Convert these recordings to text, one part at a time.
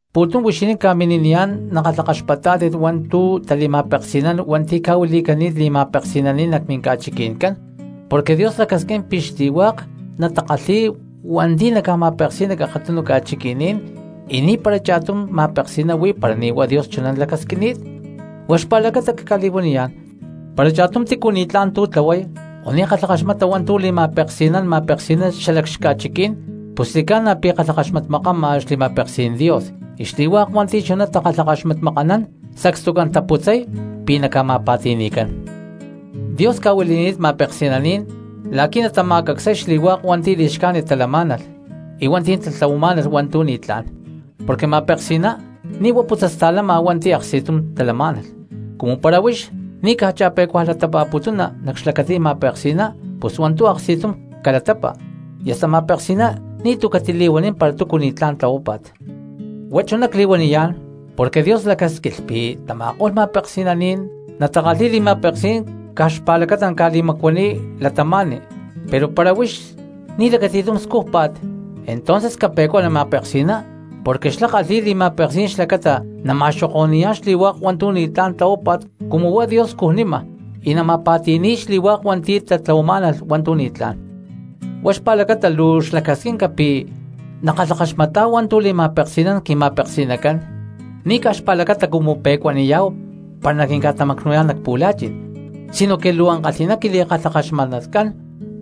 Pu̠tum huixinín ca̠mini̠niyá̠n nakalhakaxpatá̠tit hua̠ntu̠ tali̠ma̠peksi̠nán hua̠nti̠ ca̠huili̠cani̠t li̠ma̠peksi̠naní̠n nac minca̠chiqui̠ncán. Porque Dios lacasquín pi̠ xli̠hua̠k cristianos natakalhi̠y hua̠nti̠ naca̠ma̠peksi̠y nac akatunu ca̠chiqui̠ní̠n, y ni̠para cha̠tum ma̠peksi̠ná huí para ni̠ huá Dios chuná lacasquini̠t. Huá xpa̠lacata cca̠li̠huaniyá̠n, para cha̠tum tícu ni̠tlá̠n tlahuay o ni̠ kalhakaxmata hua̠ntu̠ li̠ma̠peksi̠nán ma̠peksi̠ná xalac xca̠chiquí̠n, pus xli̠ca̠na pi̠ kalhakaxmatmakama xli̠ma̠peksí̠n Dios, y xli̠hua̠k hua̠nti̠ chuná takalhakaxmatmakanán sacstucán taputzay pi̠ naca̠ma̠pa̠ti̠ni̠cán. Dios ca̠huili̠ni̠t ma̠peksi̠naní̠n la̠qui̠ natama̠cacsay xli̠hua̠k hua̠nti̠ li̠xcájnit talamá̠nalh y hua̠nti̠ tatlahuamá̠nalh hua̠ntu̠ ni̠tlá̠n, porque ma̠peksi̠ná ni̠ huá putzasta̠lama hua̠nti̠ aksti̠tum talamá̠nalh. Cumu para huix ni̠ caj cha̠pe̠cuaj latapa̠putuna nac xlacatí̠n ma̠peksi̠ná pus hua̠ntu̠ aksti̠tum calatapa, y hasta ma̠peksi̠ná ni̠tu̠ catili̠huanín para túcu ni̠tlá̠n tlahuápa̠t. Huá chuná cli̠huaniyá̠n porque Dios lacásquilh pi̠ tama̠ko̠lh ma̠peksi̠naní̠n natakalhi̠y li̠ma̠peksí̠n caj xpa̠lacata naca̠li̠macuaniy cristianos, pero para huix ni̠ lacati̠tum scújpa̠t entonces cape̠cuani ma̠peksi̠ná porque xlá kalhi̠y li̠ma̠peksí̠n xlacata nama̠xoko̠ni̠yá̠n xli̠hua̠k hua̠ntu̠ ni̠tlá̠n tlahuápa̠t cumu huá Dios scujnima y naca̠ma̠pa̠ti̠ni̠y xli̠hua̠k hua̠nti̠ tatlahuamá̠nalh hua̠ntu̠ ni̠tlá̠n. Huá xpa̠lacata luu xlacasquinca pi̠ nakalhakaxmatá̠hu hua̠ntu̠ li̠ma̠peksi̠nán quima̠peksi̠nacán, ni̠ caj xpa̠lacata cumu pe̠cuaniyá̠hu para naquinca̠tamacnu̠yá̠n nac pu̠la̠chi̠n sinoque luu ankalhi̠ná quili̠kalhakaxmatnatcán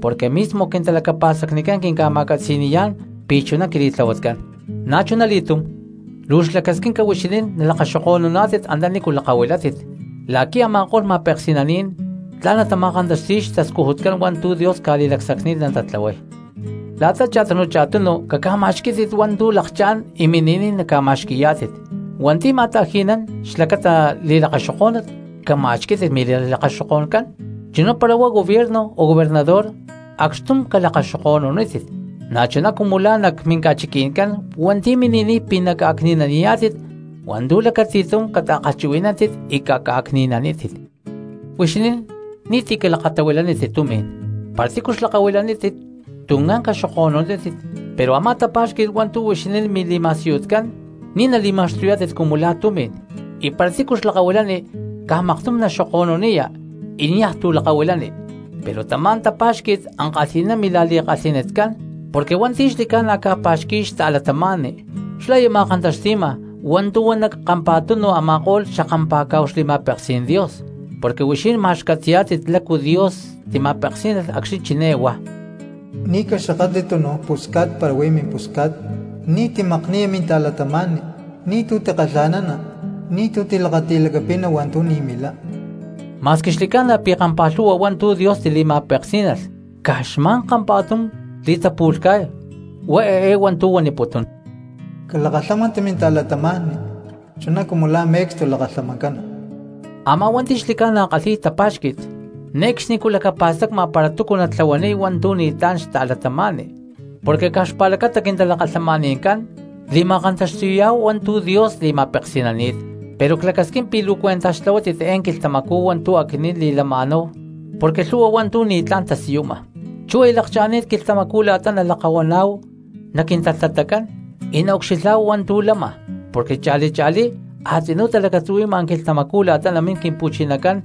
porque mismo quintalacapa̠stacnicán quinca̠ma̠catzi̠ni̠yá̠n pi̠ chuná quili̠tlahuatcán. Na̠chunali̠túm luu xlacasquinca huixinín nalakaxoko̠nuná̠tit antanícu lakahuilátit la̠qui̠ a̠ma̠ko̠lh ma̠peksi̠naní̠n tla̠n natama̠kantaxti̠y xtascujutcán hua̠ntu̠ Dios ca̠li̠lacsacni̠t natatlahuay. La̠ta cha̠tunu cha̠tunu caca̠ma̠xquí̠tit hua̠ntu̠ lakchá̠n y mini̠niy naca̠ma̠xqui̠yá̠tit. Hua̠nti̠ ma̠ta̠ji̠nán xlacata li̠lakaxokó̠nut cama̠xquí̠tit mili̠lakaxoko̠ncán, chuná para huá gobierno o gobernador acxtum calakaxoko̠nunítit; na̠chuná cumu la̠ nac minca̠chiqui̠ncán hua̠nti̠ mini̠niy pi̠ naca̠cni̠naniyá̠tit hua̠ntu̠ lacati̠tum cata̠kalhchuhui̠nántit y caca̠cni̠nanítit. Huixinín ni̠tícu calakatahuilanítit tumi̠n, para tícu xlakahuilanítit tuncán caxoko̠nunítit; pero a̠má tapa̠xqui̠t hua̠ntu̠ huixinín mili̠ma̠siyutcán ni̠ nali̠ma̠xtuyá̠tit cumu la̠ tumi̠n y para tícu xlakahuilani caj maktum naxoko̠nuniya niaj tu̠ lakahuilani, pero tamá tapa̠xqui̠t ankalhi̠ná mila̠li̠kalhi̠nitcán porque hua̠nti̠ xli̠ca̠na ca̠pa̠xqui̠y xta̠cristianos xlá aya ma̠kantaxti̠ma hua̠ntu̠ huan nac kampa̠tunu a̠ma̠ko̠lh xakampa̠cá̠hu xli̠ma̠peksí̠n Dios. Porque huixinín ma̠x catzi̠yá̠tit lácu Dios tima̠peksí̠nalh acxni̠ chiné huá: “Ni̠ caxakatli túnuj pusca̠t para huí mimpusca̠t, ni̠tu̠ timakni̠ya minta̠cristiano, ni̠tu̠ timakkalha̠nana minta̠cristiano, ni̠tu̠ tilakati̠lacapina hua̠ntu̠ kalhi̠y minta̠cristiano.” Ma̠squi xli̠ca̠na pi̠ kampa̠lhu̠hua hua̠ntu̠ Dios tima̠peksí̠nalh caj xma̠n kampa̠tum li̠tapu̠lhca̠y, huá eé hua̠ntu̠ huaniputún: “Calakalhámanti minta̠cristiano chuná cumu la̠ me̠cstu lakalhamancana.” Amá cristiano hua̠nti̠ xli̠ca̠na kalhi̠y tapa̠xqui̠t ne̠cxnicú lacapa̠stacma para túcu natlahuaniy hua̠ntu̠ ni̠tlá̠n xta̠cristiano, porque caj xpa̠lacata quintalakalhamani̠ncán li̠ma̠kantaxti̠yá̠hu hua̠ntu̠ Dios li̠ma̠peksi̠nani̠t. Pero clacasquín pi̠ luu cuentaj xtlahuátit eé quilhtamacú hua̠ntu̠ aquinín li̠lama̠náhu porque lhu̠hua hua̠ntu̠ ni̠tlá̠n tasiyuma. Chú aya lakcha̠ni̠t quilhtamacú la̠ta nalakahuaná̠hu nac quintalhtatacán y naucxilhá̠hu hua̠ntu̠ lama porque cha̠li cha̠lí a̠tzinú talacatzuhui̠ma quilhtamacú la̠ta namín Quimpu̠chinacán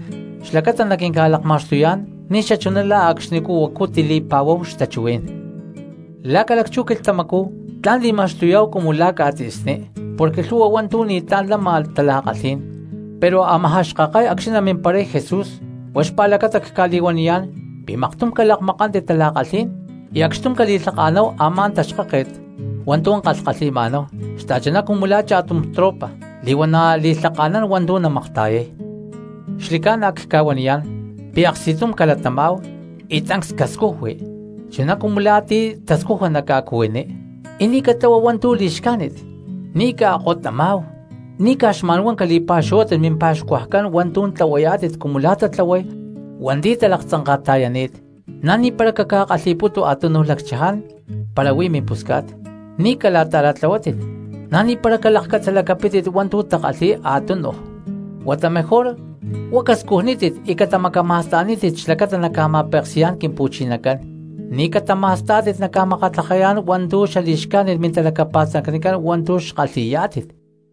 xlacata naquinca̠lakma̠xtuyá̠n ni̠xachuná la̠ acxni̠ huacu tili̠pa̠huáhu xtachuhuí̠n. Lá ca̠lacchú quilhtamacú tla̠n li̠ma̠xtuyá̠hu cumu la̠ ca̠tzi̠sní porque lhu̠hua hua̠ntu̠ ni̠tlá̠n lama tala̠kalhí̠n, pero amajá xkakay acxni̠ namimparay Jesús. Huá xpa̠lacata cca̠li̠huaniyá̠n pi̠ maktum calakmakántit tala̠kalhí̠n y acxtum cali̠lhaka̠náhu a̠má taxkáket hua̠ntu̠ kalhkalhi̠ma̠náhu, xta̠chuná cumu la̠ cha̠tum tropa li̠huana̠ li̠lhaka̠nán hua̠ntu̠ namakta̠yay. Xli̠ca̠na cca̠huaniyá̠n pi̠ aksti̠tum calatamá̠hu y tancs cascujui chuná cumu la̠ ti̠ tascuja nac ca̠cuhuiní, y ni̠ catlahuáhu hua̠ntu̠ li̠xcájnit, ni̠ caakkottamá̠hu, ni̠ caj xma̠nhuá cali̠pa̠xuhuátit mimpa̠xcuajcán hua̠ntu̠ tlahuayá̠tit cumu la̠ tatlahuay hua̠nti̠ talaktzanka̠ta̠yani̠t, na̠ ni̠para caca̠kalhi̠pútu a̠túnuj lacchaján para huí mimpusca̠t, ni̠ cala̠ta̠ra̠tlahuátit, na̠ ni̠para calakcatzalacapítit hua̠ntu̠ takalhi̠y a̠túnuj cristianos. Huata mejor huá cascujnítit y catamacama̠sta̠nítit xlacata naca̠ma̠peksi̠yá̠n Quimpu̠chinacán, ni̠ catama̠stá̠tit naca̠makatlajayá̠n hua̠ntu̠ xali̠xcájnit mintalacapa̠stacnicán hua̠ntu̠ xkalhi̠yá̠tit.